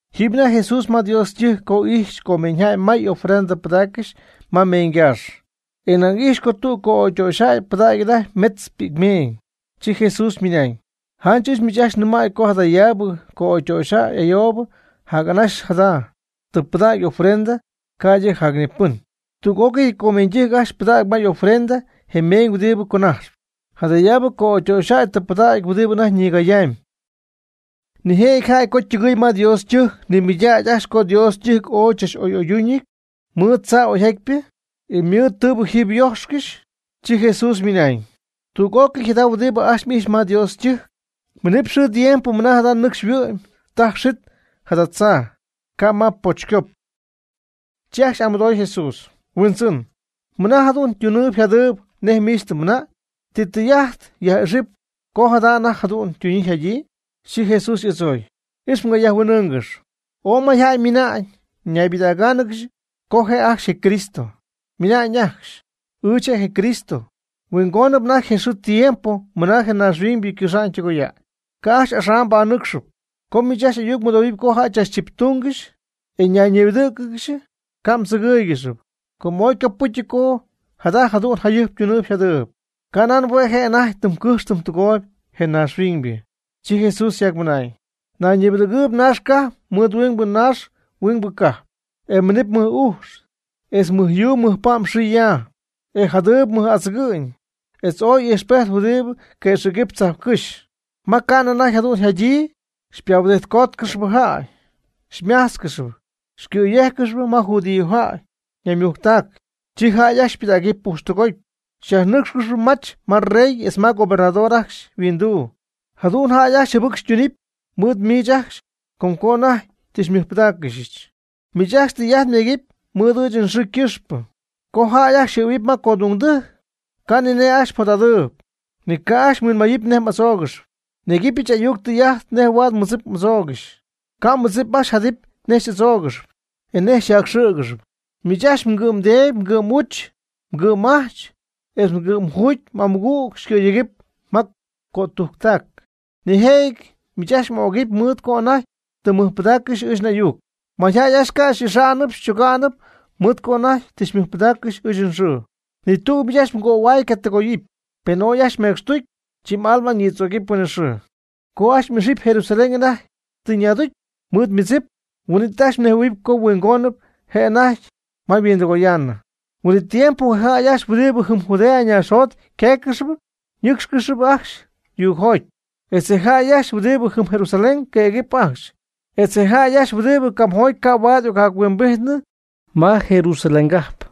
Jiiby anajty Jesús ma Dios ytɨjc co ijxy comeeñyjäy may'amy ofrenda pɨdaaccɨxy ma meeñygaax. E nañ ijxy co tüg co'ögytöxyjäy pɨdägy anajty metz pi'cmeeñ. Chi Jesús ymɨnañ: ―Janch ɨɨch miich ajcxy nɨmäy co jadayaabɨ co'ögytöxyjäy ayoob jac anaxy jada, tɨ pɨdägy ofrenda ca'ydɨ jacnipɨn. Tüg'ócɨy comeeñydɨjc ajcxy ypɨdacyp ma ofrenda je meeñ huɨdi conajxp. Jadayaabɨ co'ögytöxyjäy tɨ pɨdägy huɨdi anajty ñigayamy. Nijëjɨty jäy co ytɨgɨɨy ma Dios ytɨjc nimɨydacy ajcxy co Dios ytɨjc ooy chach'oy'oydúñɨty mɨɨd tzaa oyjatpyɨ, e mɨɨd tɨɨbɨ jiiby yojxcɨxy. Chi Jesús ymɨnañ: ―Tüg'ócɨy jada huɨdi ajcxy m'ijxpy ma Dios ytɨjc, minɨp xɨɨ tiempo mɨna jada nɨcxy yhuɨ'my taj xit jada tzaa, ca' ma pochycop. Chi ajcxy y'amɨdooy Jesús: ―Huindzɨn, ¿mɨna jada jadu'n ytunɨɨyb yjadɨɨyb nej miich tɨ mmɨnañ? ¿Ti tɨy'ajt ji yaj'ixɨp co jada anajty jadu'n ytuna'ñyii yjada'ñyii? Chi Jesús y'adzooy: ―Ix mgayajhuin'ɨɨngɨx. Ooy mayjäy ymina'ñ ñaybɨdägáanɨgɨxy co je' ajcxy je Cristo, ymɨna'ñ ajcxy: “Ɨɨch je' je Cristo; huingóniñ anajty je xɨɨ je tiempo mɨna je naaxhuiñybɨ ycɨxa'ñ ytɨgoya'ñ.” Ca' ajcxy axam mbanɨcxɨpy. Co miich ajcxy ayuc mɨdohuɨpy co jäy chachchiptungɨxy, e ñayñibɨdɨ̈cɨgɨxy, ca' mdzɨgɨ́ɨygɨxɨpy, com ooy ycopɨ́cyɨty co jada jadu'n jayɨjp ytunɨɨyb yjadɨɨyb, ca'nan hue' je' anajty tɨm cɨjxp tɨm tɨgooyb (je naaxhuiñybɨ). Chi Jesús yjacmɨnañ: ―Nayñibɨdägɨɨb naax cajp mɨɨd huingbɨ naax huingbɨ cajp. E minɨp mɨc'ujx, etz mɨj yuu mɨj pa'm xɨɨ yaa. E jadɨɨb mɨj'adzɨgɨ'ñ, etz ooy ijxpejt huɨdi qüexɨ̈gɨp tzajpcɨ́xy. Ma ca'nɨ anajty jadu'n jadyii, xypahuɨdijtcóotcɨxɨpy jäy, xymájtzcɨxɨpy, xycɨ̈yéjcɨxɨpy ma judíojäy ñaymujctac. Chi jäy ajcxy xypɨdägɨpy pujxtɨgoty, xyajnɨ́cxcɨxɨpy mach ma rey etz ma gobernador ajcxy yhuinduu. Jadu'n jäy ajcxy jɨbɨc xytunɨpy mɨɨd miich ajcxy com co anajty tɨ xymɨjpɨdáaccɨxyɨch. Miich ajcxy tɨy'ajt myegɨpy mɨɨd ɨɨch nxɨɨ ycɨxpɨ. Co jäy ajcxy yxɨ̈huɨpy ma codungdɨjc, ca' ni nej ajcxy mjot'adɨɨyb, ni ca' ajcxy mhuinmayɨpy nej m'adzóogɨxɨpy. Nyegɨpyɨch ayuc etz tɨy'ajt nej huaad mmɨdzip m'adzoogɨxy. Ca' mmɨdzip ajcxy jadɨpy nej xy'adzóogɨxɨpy, e nej xyjacxɨ̈gɨxɨpy. Miich ajcxy mgɨ'mdeedy, mgɨ'm'uch, mgɨ'm'ajch, etz mgɨ'm ajuugy amɨgüg xycɨ̈yéjcɨxɨpy ma cötujctac. Nijëjɨty miich ajcxy m'ögɨpy mɨɨd co anajty tɨ mmɨjpɨdaaccɨxy ɨɨch n'ayuc. Mayjäy ajcxy ca' xy'ixaanɨpy xychogaanɨpy mɨɨd co anajty tɨ mmɨjpɨdaaccɨxy ɨɨch nxɨɨ. Ni tüg miich ajcxy mgöhuay ca' ytɨgoyɨpy. Pen ooy ajcxy mmecxtucy, chi m'alma ñïdzögɨpy huinɨxɨɨ. Co ajcxy m'ixɨpy Jerusalén anajty tɨ ñaducy mɨɨd ymɨdzip, huin'it ajcxy mnejhuɨ̈huɨpy co huingon je'anajty ma yhuindɨgoyaanɨ. Huin'it tiempo je jäy ajcxy huɨdi jɨm Judea naaxjot yquéeccɨxɨpy ñɨ́cxcɨxɨpy ajcxy yuugjoty, etz je jäy ajcxy huɨdi jɨm Jerusalén queegɨpy ajcxy, etz je jäy ajcxy huɨdi camjoty ca' huaad y'occajptɨgɨɨyñɨ ma je Jerusalén cajp.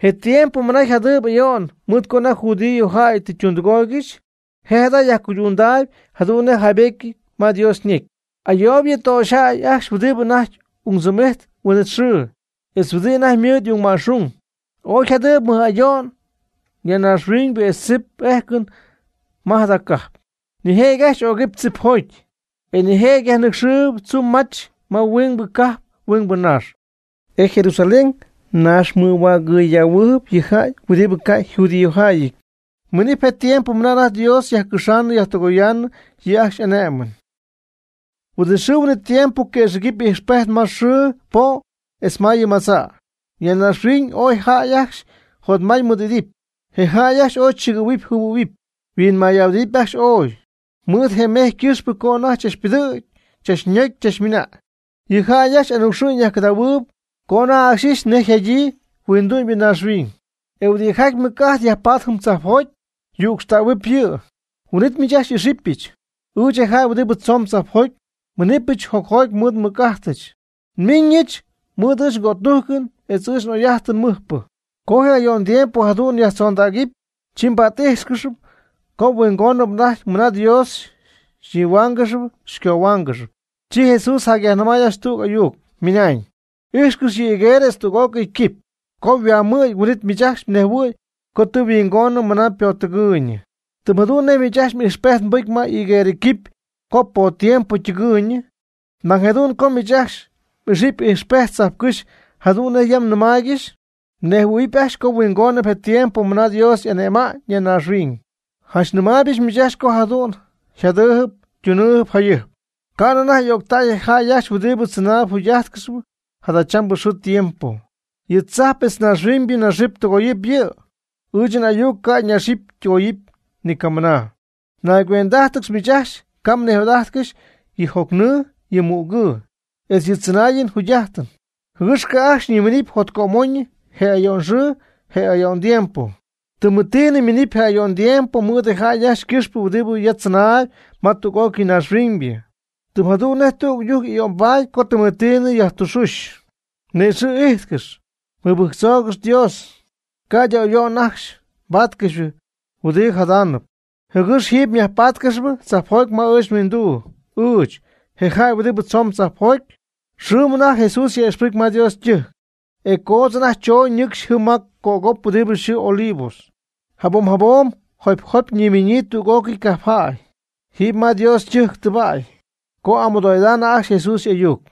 Je tiempo mɨna yjadɨɨyb ayo'n mɨɨd co anajty judío jäy tɨ ytundɨgooygɨxy, je' jada yajcuydundaayb jadu'n nej yjaaybétyɨty ma Dios ñecy. ¡Ayoob yɨ töxyjäy ajcxy huɨdi anajty ung tzɨm'ijtp huin'it xɨɨ, etz huɨdi anajty mɨɨd y'ungma'xung! Ooy jadɨɨb mɨj ayo'n ya naaxhuin etz tzip éjcɨn ma jada cajp. Nijëjɨty ajcxy y'ögɨpy tzipjoty, e nijëjɨty yajnɨcxɨp tzumy mach ma huingbɨ cajp huingbɨ naax. E Jerusalén naxmɨhuägɨydähuɨɨb yɨ jäy huɨdi ca' yjudiojäyɨty, minɨpy je tiempo mɨna anajty Dios yajcɨxaanɨ yajtɨgoyaanɨ yɨ' ajcxy y'ané'mɨn. Huin'it xɨɨ huin'it tiempo quëxɨ̈gɨp ijxpejt ma xɨɨ po' etz ma yɨ madza', ya naaxhuiñ ooy jäy ajcxy jotmay mɨɨ'idɨpy. Je jäy ajcxy ooy chɨgɨ̈huɨpy yjɨhuɨ̈huɨpy yhuinmay'ahuɨdidɨpy ajcxy ooy, mɨɨd je mejy ycɨxpɨ co anajty chachpɨdɨ̈gy chachnögy chachmɨna'ñ. Yɨ jäy ajcxy anucxɨ'ñ yajcɨdahuɨɨb co anajty ajcxy ixy nej yjadyii huindu'mybɨ naaxhuiñ; e huɨdijaty mɨc'ajt yajpatp jiiby tzajpjoty yücxtähuɨpy yɨ'. Huin'it miich ajcxy xy'ixɨpyɨch, ɨɨch je jäy huɨdi tzoon tzajpjoty, nmiiñɨch jocjoty mɨɨd je nmɨc'ajtɨch, nmiiñɨch mɨɨd ɨɨch ngötújcɨn etz ɨɨch n'oy'ájtɨn mɨjpɨ. Co je ayo'n tiempo jadu'n yjatzondägɨpy, chi mba't'íjxcɨxɨpy com huingoniñ anajty mɨna Dios xyñihuáangɨxɨpy xycohuáangɨxɨpy. Chi Jesús yajnɨmay ajcxy tüg ayuc, ymɨnañ: ―Ijxcɨx yɨ higuerɨ etz tüg'ócɨy quipy, co yhuamɨ̈gy huin'it miich ajcxy nejhuɨ̈y co tɨ yhuingonɨ mɨna ypottɨgɨɨyñɨ. Tɨm jadu'n nej miich ajcxy ijxpejt mbɨcy ma higuerɨ quipy co pottiempo ytɨgɨɨyñɨ, nañ jadu'n co miich ajcxy m'ixɨpy je ijxpejt tzajpcɨ́xy jadu'n nej yam nyajnɨmaaygɨxy, mnejhuɨ̈huɨpy ajcxy co huingónɨp je tiempo mɨna Dios y'ane'ma'ñ ya naaxhuiñ. Janch nɨmaaybɨch miich ajcxy co jadu'n yjadɨɨyb ytunɨɨyb jayɨjp, ca' anajty o'ctäy je jäy ajcxy huɨdibɨ tzɨnaayb jugy'ájtcɨxyp jadachambɨ xɨɨ tiempo. Yɨ tzajp etz naaxhuiñybɨ naxɨp tɨgoyɨp yɨ'. Ɨɨch n'ayuc ca' ñaxɨpy ytɨgoyɨpy ni camɨna. Naygüend'ájtɨgɨx miich ajcxy ca' mnijot'ájtcɨxy yɨ jocnɨɨ yɨ mügɨɨ, etz yɨ tzɨnaayɨn jugy'ájtɨn, jɨgɨx ca' ajcxy xyniminɨpy jotcömoñyɨ je ayo'n xɨɨ je ayo'n tiempo. Tɨmetiinɨ minɨpy je ayo'n tiempo mɨɨd jäy ajcxy ycɨxpɨ huɨdi ya tzɨnaayb ma tüg'ócɨy naaxhuiñybɨ. Tɨm jadu'n nej tüg ɨyujc ayo'nbaady co tɨmetiinɨ yajtüxuuch. Ni'ixɨ' ijtcɨx, mɨbɨjctzoogɨx Dios, ca'ydɨ ayo'n ajcxy mbaatcɨxy huɨdi jadaanɨp, jɨgɨx jiiby myajpáatcɨxɨpy tzajpjoty ma ɨɨch nhuinduu, ɨɨch, je jäy huɨdi tzoon tzajpjoty. Xɨɨm anajty Jesús yaj'ixpɨcy ma Dios ytɨjc, e coodz anajty chooñ ñɨcxy jɨm ma cögop huɨdi yxɨɨ Olivos. Jabom jabom jopy jopy ñiminyii tüg'ócɨy cajpjäy jiiby ma Dios ytɨjc tɨbäy co y'amɨdoo'idaanɨ ajcxy Jesús y'ayuc.